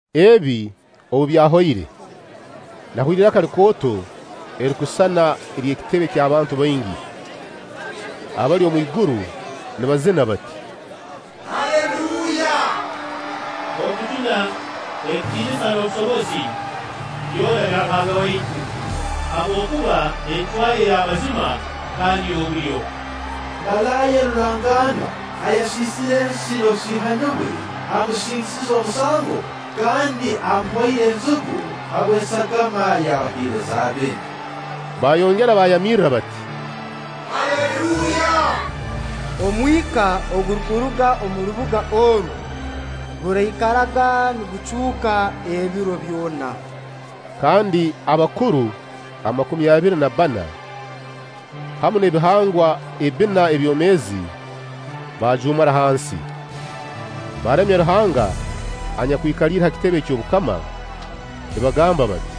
Ebi obu byahoire, nahurra iraka likooto erirukusisana ery'ekitebe ky'abantu baingi abali omwiguru nibazina bati: “Haleluya! Okujuna, ekitiinisa n'obusobozi, byona bya Ruhanga waitu. Habwokuba encwa ye y'amazima kandi y'obulyo. Malaaya rurangaanwa ayasiisire ensi n'obusiihani bwe amusingisize omusango kandi amuhoire enzigu habw'esagama y'abaheereza be.” Baayongera baayamirra bati: “Haleluya! Omwika ogurukuruga omu rubuga oru guraikaraga nigucuuka ebiro byona.” Kandi abakuru amakumi abiri na bbana, hamu n'ebihangwa ebbina ebyomeezi baajuumara hansi, baaramya Ruhanga anyakwikaliire ha kitebe eky'obukama nibagamba bati: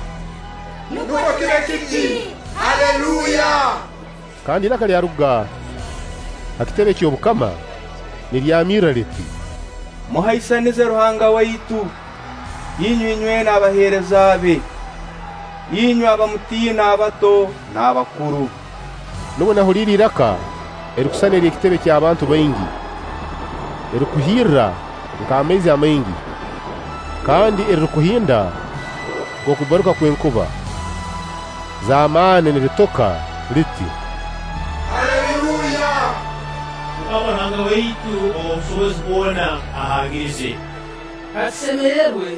“Nukwo kibe kiti. Haleluya!” Kandi iraka lyaruga ha kitebe ky'obukama niryamirra liti: “Muhaisanize Ruhanga waitu, inywe inywena abaheereza be, inywe abamutiina abato n'abakuru!” Nubwo nahuliire iraka erirukusisana ery'ekitebe ky'abantu baingi, erirukuhirra nk'amaizi amaingi kandi erirukuhinda nk'okubbaruka kw'enkuba z'amaani niritoka liti: “Haleluya! MUKAMA Ruhanga waitu ow'obusobozi bwona ahangiriize. Katusemererwe,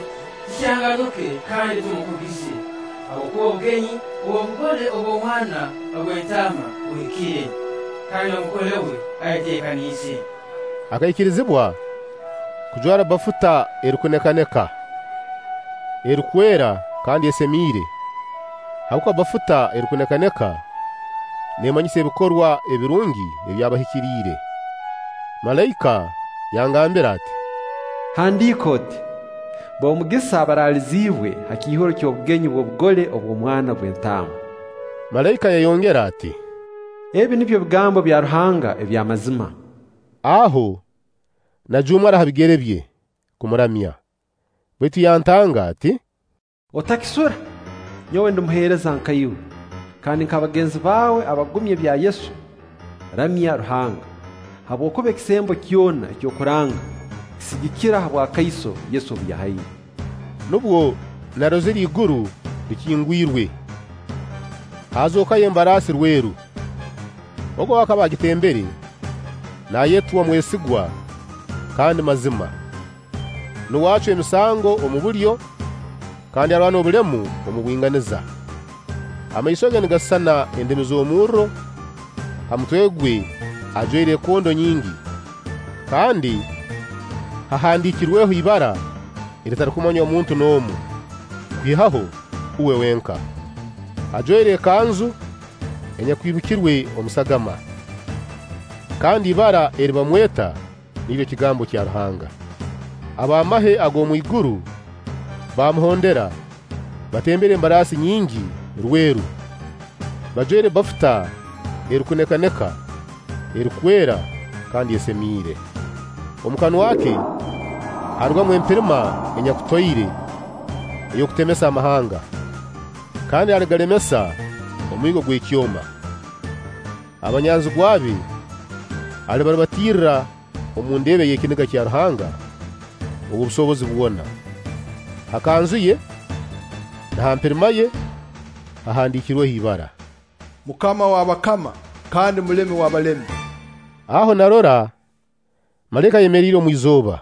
tukyanganuke kandi tumukugize, habwokuba obugenyi bw'obugole obw'Omwana gw'Entaama buhikire, kandi Omugole we ayeteekaniize; akaikirizibwa kujwara bafuta erukunekaneka, erukwera kandi esemiire” habwokuba bafuta erukunekaneka neemanyisa ebikorwa ebirungi eby'abahikiriire. Malaika yangambira ati: “Handiika oti: B'omugisa abaraliziibwe ha kiihuro ky'obugenyi bw'obugole obw'Omwana gw'Entaama.” Malaika yayongera ati: “Ebi nibyo bigambo bya Ruhanga ebya mazima.” Aho najuumara ha bigere bye kumuramya, baitu yantanga ati: “Otakisura! Nyowe ndi muheereza nka iwe, kandi nk'abagenzi bawe abagumya ebya Yesu. Ramya Ruhanga.” Habwokuba ekisembo kyona eky'okuranga kisigikira ha bwakaiso Yesu obu yahaire. Nubwo narozire iguru likingwirwe, haazookayo embaraasi rweru! Ogu ow'akaba agitembere, naayetwa Mwesigwa kandi Mazima, nuwe acwa emisango omu bulyo kandi arwana obulemu omu bwinganiza. Amaiso ge nigasisana endimi z'omurro, ha mutwe gwe ajwaire ekondo nyingi, kandi hahandiikirweho ibara eritarukumanywa muntu n'omu kwihaho uwe wenka. Ajwaire ekanzu enyakwibikirwe omu sagama, kandi ibara eri bamweta niryo Kigambo kya Ruhanga. Ab'amahe ag'omwiguru baamuhondera batembere embaraasi nyingi rweru, bajwaire bafuta erukunekaneka, erukwera kandi esemiire. Omu kanwa ke haarugamu empirima enyakutoire ey'okutemesa amahanga, kandi aligalemesa omwigo ogw'ekyoma; abanyanzigwa be alibarubatirirra omu ndeeba ey'ekiniga kya Ruhanga ow'obusobozi bwona. Ha kanzu ye na ha mpirima ye hahandiikirweho ibara: MUKAMA w'abakama kandi Mulemi w'abalemi. Aho narora malaika ayemeriire omu izooba,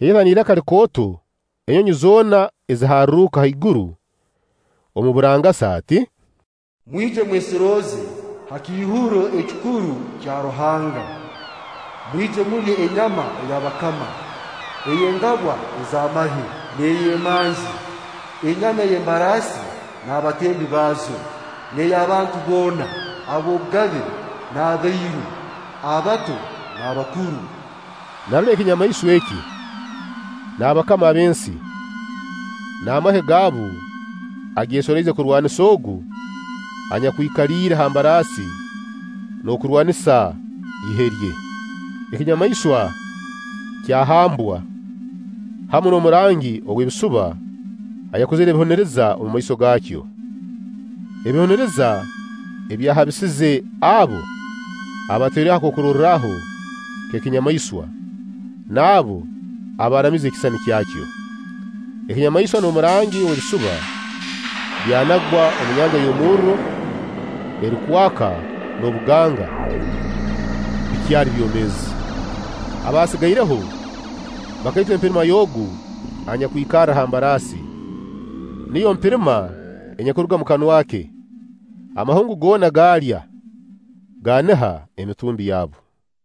yayeta n'iraka likooto enyonyi zoona eziharruka haiguru omu burangasa ati: “Mwije mwesorooze ha kiihuro ekikuru kya Ruhanga! Mwije mulye enyama ey'abakama, ey'engabwa ez'amahe, n'ey'emanzi: enyama ey'embaraasi n'abatembi baazo, n'ey'abantu boona, ab'obugabe n'abairu, abato n'abakuru!” Narora ekinyamaiswa eki, n'abakama ab'ensi, n'amahe gaabu ageesoroize kurwanisa Ogu anyakwikaliire ha mbaraasi n'okurwanisa ihe rye. Ekinyamaiswa kyahambwa hamu n'omurangi ow'ebisuba ayakozire ebihuniriza omumaiso gaakyo. (Ebihuniriza ebyahabisize abo abatairweho akarorwaho k'ekinyamaiswa n'abo abaaramize ekisisani kyakyo.) Ekinyamaiswa n'omurangi ow'ebisuba byanagwa omu nyanja y'omurro erukwaka n'obuganga bikyali byomeezi. Abaasigaireho bakaitwa empirima y'Ogu anyakwikarra ha mbaraasi, niyo mpirima enyakuruga omu kanwa ke; amahungu goona gaalya gaaniha emitumbi yabo.